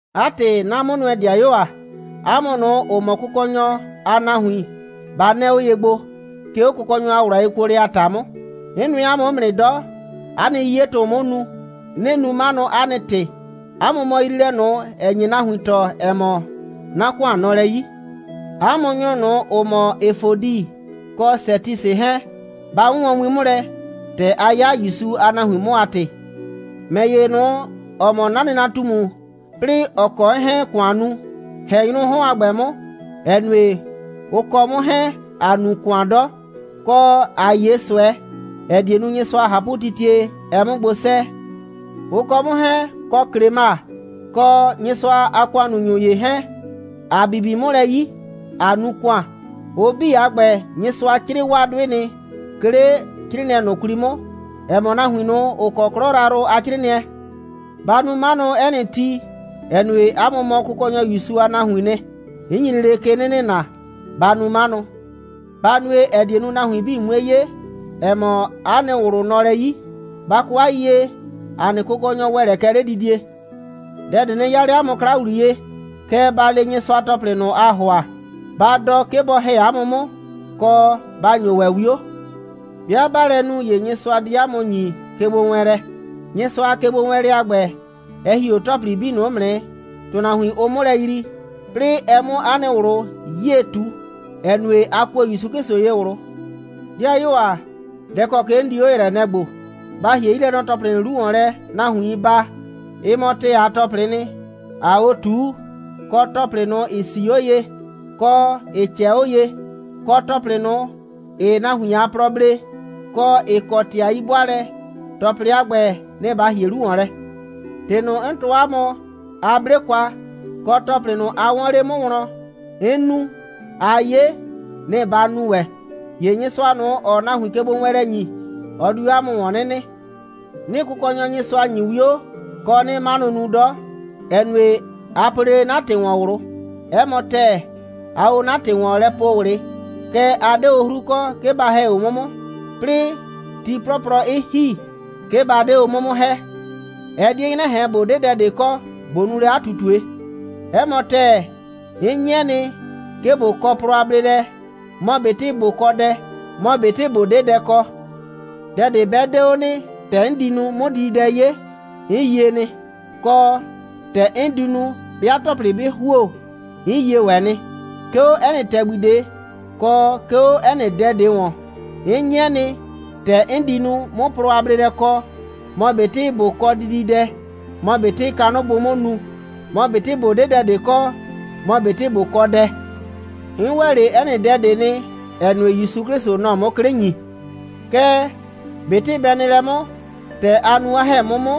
'A ‑tɩ, 'na 'mʋnʋɛ‑dɩayuo ‑a, 'a mʋ ꞊nʋ, ‑ʋ mɔ Kʋkɔnyɔ a nahuin, ba 'nɛɛ 'o ye gbo, 'ke 'o Kʋkɔnyɔ a ꞊wlʋ a yekuolɛ a ‑ta 'mʋ. 'N nʋɛ 'a mʋ 'mʋ nɩ 'dɔ. 'A nɩ 'yiyetʋ‑ʋ 'mʋ nu. 'Nɩɩ nu 'manʋ, 'a nɩ ‑tɩ. 'A mʋ mɔ yriilɛ ꞊nʋ, ‑ɛ nye nahuin tɔɔ, ‑ɛ mɔ, 'na ‑kʋan nɔ lɛ 'yi. 'A mʋ nyrʋ ꞊nʋ, ‑ʋ mɔ Efodi kɔ Sɛtisɩ 'hɛɛn, ba 'wʋnwɔn win 'mʋ lɛ, ‑tɛ a 'ya ‑Yusu a nahuin 'mʋ a ‑tɩ. ‑Mɛ ‑ye ꞊nʋ, ‑ɔ mɔ 'na nɩnatumu, 'plɩɩ ‑ɔ kɔ 'n 'hɛɛn‑ ‑kʋan nu, ‑hɛ nyrʋʋ 'hɔn a ‑gbɛ 'mʋ, ‑ɛ nue, ʋ kɔ 'mʋ 'hɛɛn, ‑a nu ‑kʋan 'dɔ, kɔ ꞊a 'ye ꞊sʋɛ, ‑ɛ die nu, Nyɩsʋa a ꞊hapʋtitie, ɛ 'mʋ gbo 'sɛɛ. Ʋ kɔ 'mʋ 'hɛɛn, kɔ Klema, kɔ Nyɩsʋa a ‑kʋannunyʋ ‑ye 'hɛɛn, ‑a bibi 'mʋ lɛ 'yi, ꞊a nu ‑kʋan. Ʋ 'bii a ‑gbɛ, Nyɩsʋa 'crɩɩ 'waa 'dʋɩ nɩ, 'ke 'le 'crɩɩnɩɛ ꞊nʋ 'kwli 'mʋ, ‑ɛ mɔ nahuin ꞊nʋ, ‑ʋ kɔ 'klɔ yrayrʋ a 'crɩɩnɩɛ. Ba nu 'manʋ, 'ɛ nɩ ti, ‑ɛ nue, 'a mʋ mɔ Kʋkɔnyɔ ‑Yusu a nahuiin nɩ. 'N nyi lele ke 'nɩ nɩna, ba nu 'manʋ. Ba nue, ‑ɛ die nu, nahuin 'bii 'mue 'ye, ‑ɛ mɔ, 'a nɩ ꞊wlʋ nɔ lɛ 'yi. Ba kɔ 'a yiyie, ‑a nɩ Kʋkɔnyɔ ‑wɛ lɛ kɛ 'ledidie. Dɛ ꞊de nɩ 'yaa 'le 'a mʋ 'kla ‑wliye, kɛɛ, ba le Nyɩsʋa ‑tɔplɩ 'bii ꞊nʋ, aa ‑hʋa. Ba dɔ, 'ke bɔ ‑hɛ 'a mʋ 'mʋ, kɔ, ba ‑nyo ‑wɛ 'wio. 'Bɩa 'baa lɛ nu, ‑ye Nyɩsʋa di 'a mʋ ‑nyi kegbowɛɛnlɛ. Nyɩsʋa a kegbowɛɛnlɛ a ‑gbɛ, ɛ ‑hi 'o ‑tɔplɩ 'bii ꞊nʋ 'mʋ nɩ, ‑tʋnahuin, ʋʋ 'mʋ lɛ yrii, 'plɩɩ ɛ 'mʋ 'a nɩ ꞊wlʋ 'yie ꞊tu, ‑ɛ nue, a kuo ‑Yusu 'Klɩsʋ ye ꞊wlʋ. 'Dɩayuo ‑a, dɛ ‑kɔ ke 'n di 'o ‑yrɛɛ, nɛ‑ ‑gbo: Ba ‑hie 'yilɛnɔ‑tɔplɩ ꞊nʋ 'lu ‑wɔn lɛ, nahuiin baa. Ɩ mɔ ‑tɛɛ a ‑tɔplɩɩ nɩ, ‑aa 'o ꞊tuu, kɔ ‑tɔplɩ ꞊nʋ, ‑ɩ 'sii 'o ye, kɔ, ‑ɩ ꞊cɛɛ 'o ye, kɔ ‑tɔplɩ ꞊nʋ, ‑ɩɩ nahuin a plɔ blee, kɔ, ‑ɩ kɔ ‑tɩ a 'yi'bʋaalɛ. ‑Tɔplɩ a ‑gbɛ, nɩ‑ ba ‑hie 'lu ‑wɔn lɛ. ‑Tɩ ꞊nʋ, 'n tɔɔ 'a mʋ, a 'ble kwa, kɔ, ‑tɔplɩ ꞊nʋ, a 'wɔɔn 'le 'mʋ wlɔn, 'n nu, a 'ye, nɩ‑ ba nu ‑wɛ. ‑Ye Nyɩsʋa ꞊nʋ, ‑ɔɔ nahuin kegbowɛɛnlɛ ‑nyi, ɔ di 'o 'a mʋ ‑wɔn 'nɩ nɩ. 'Nɩɩ Kʋkɔnyɔ ‑Yusu ‑nyi 'wio, kɔ, 'nɩɩ 'manʋ nu 'dɔ, ‑ɛ nue, a po lele 'na ‑tɩ ‑wɔn ꞊wlʋ. 'Ɛ mɔ ‑tɛɛ, aa o 'na ‑tɩ ‑wɔn lɛ po ꞊wlɩ, kɛɛ, a 'de o 'hru kɔ, 'ke ba ‑hɛ o 'mʋ 'mʋ, 'plɩɩ ti 'plɔplɔ 'ɩ ‑hi, 'ke ba 'de o 'mʋ 'mʋ ‑hɛ. Ɛ 'die 'nyrɛ ꞊hɛn, ꞊bo 'de dɛ ꞊de kɔ, ꞊bo nu lɛ 'a ꞊tutue. 'Ɛ mɔ ‑tɛɛ, 'n 'nyɩɛ nɩ, 'ke ꞊bo kɔ plɔ a bleelɛ, mɔ ꞊betɩ ꞊bo kɔ dɛ, mɔ ꞊betɩ ꞊bo 'de dɛ kɔ. Dɛ ꞊de 'bɛ 'de 'o nɩ, ‑tɛ 'n di nu, 'mʋ dididɛ 'ye, 'n yie nɩ, kɔ, ‑tɛ 'n di nu, 'bɩa ‑tɔplɩ 'bɩ ‑huo, 'n yie ‑wɛ nɩ. 'Ke 'o 'ɛ nɩ ‑tɛgbi ꞊de, kɔ 'ke 'o 'ɛ nɩ dɛ ꞊de ‑wɔn, 'n 'nyɩɛ nɩ, ‑tɛ 'n di nu, 'mʋ plɔ a bleelɛ kɔ, mɔ ꞊betɩ ꞊bo kɔ dididɛ, mɔ ꞊betɩ kanʋ bʋʋ 'mʋ nu, mɔ ꞊betɩ ꞊bo 'de dɛ ꞊de kɔ, mɔ ꞊betɩ ꞊bo kɔ dɛ. 'N ‑wɛ 'le 'ɛ nɩ dɛ ꞊de nɩ, ‑ɛ nue, ‑Yusu 'Klɩsʋ, nɔ‑ɔ 'mʋ 'klɩ ‑nyi. Kɛɛ, ꞊betɩ bɛ nɩ lɛ 'mʋ, ‑tɛ a nu, 'a ‑hɛ 'mʋ 'mʋ,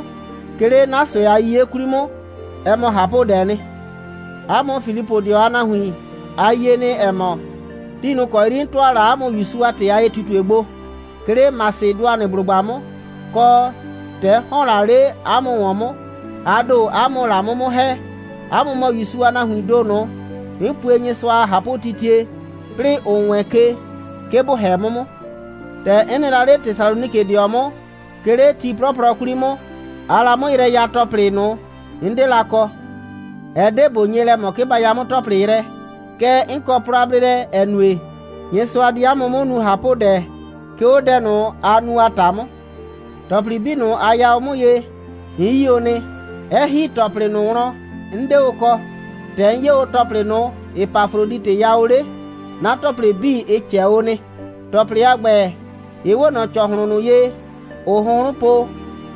'ke 'le 'na ꞊sʋɛ a 'yiye 'kwli 'mʋ, ɛ mɔ ꞊hapʋdɛɛ nɩ. 'A mʋ Filipʋdɩɔ a nahuin, a yie nɩ, ‑ɛ mɔ, ti ꞊nʋ ‑kɔ 'yri 'n ‑tʋa la 'a mʋ ‑Yusu a ‑tɩ a ye꞊tutue gbo, 'ke 'le Masɩdʋanɩblʋgba 'mʋ, kɔ, ‑tɛ 'n ‑hɔn la 'le 'a mʋ ‑wɔn 'mʋ, a ‑do, 'a mʋ‑ʋ la 'mʋ 'mʋ ‑hɛ. 'A mʋ mɔ ‑Yusu a nahuiin ‑do ꞊nʋ, 'n pue Nyɩsʋa a ꞊hapʋtitie, 'plɩɩ 'n wɛɛn ke, 'ke ‑bʋ ‑hɛ 'mʋ 'mʋ. ‑Tɛ 'n nɩ la 'le Tesalonikɩdɩɔ 'mʋ, 'ke 'le ti 'plɔplɔ 'kwli 'mʋ, aa la 'mʋ yrɛ ya ‑tɔplɩ ꞊nʋ, 'n 'de la kɔ. Ɛ 'de ꞊bo nye lɛ ꞊mɔ, 'ke ba ya 'mʋ ‑tɔplɩ yrɛ, kɛɛ, 'n kɔ plɔ a bleelɛ, ‑ɛ nue, Nyɩsʋa di 'a mʋ 'mʋ nu ꞊hapʋdɛ, 'ke 'o dɛ ꞊nʋ, aa nu a ‑ta 'mʋ. ‑Tɔplɩ 'bii ꞊nʋ, a ya o 'mʋ ye, 'n 'yi o nɩ, 'ɛ ‑hi ‑tɔplɩ ꞊nʋ wlɔn, 'n 'de o kɔ. ‑Tɛ 'n 'ye o ‑tɔplɩ ꞊nʋ, Epafroditɩ ya o 'le, 'na ‑tɔplɩ 'bii, ɩ ꞊cɛ o nɩ. ‑Tɔplɩ a ‑gbɛ, ɩ 'we ꞊nɔ ‑cɔhlʋn ꞊nʋ ye, ‑ʋʋ hʋnhrʋn po,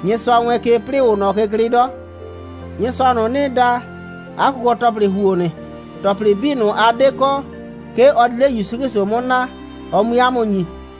Nyɩsʋa wɛɛn ke, 'plɩɩ ‑ʋʋ ꞊nɔ ke klɩɩ 'dɔ. Nyɩsʋa ꞊nʋ, 'nɩɩ da, 'a kʋkɔ‑tɔplɩ ‑huo nɩ. ‑Tɔplɩ 'bii ꞊nʋ, a 'de kɔ, 'ke ɔ di 'le ‑Yusu 'Klɩsʋ 'mʋ naa, ɔ 'mui 'a mʋ ‑nyi.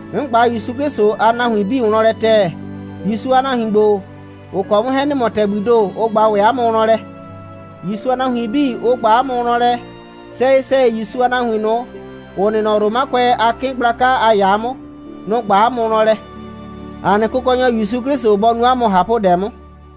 'N ꞊gba ‑Yusu 'Klɩsʋ a nahuin 'bii wlɔn lɛ ‑tɛɛ. ‑Yusu a nahuin ‑gbo, ‑ʋ kɔ 'mʋ 'hɛɛn ‑nɩ mɔ ‑tɛgbii ‑do, ʋ ꞊gba ‑wɛ 'a mʋ wlɔn lɛ. ‑Yusu a nahuin 'bii, ʋ ꞊gba 'a mʋ wlɔn lɛ. Sɛyɩ‑sɛyɩ, ‑Yusu a nahuin ꞊nʋ, ‑ʋ nɩ nɔ Romakʋɛ a 'kɩɩn gblaka a ‑yaa 'mʋ, nʋ‑ ꞊gba 'a mʋ wlɔn lɛ. ‑A nɩ Kʋkɔnyɔ ‑Yusu 'Klɩsʋ bɔ nu 'a mʋ ꞊hapʋdɛ 'mʋ.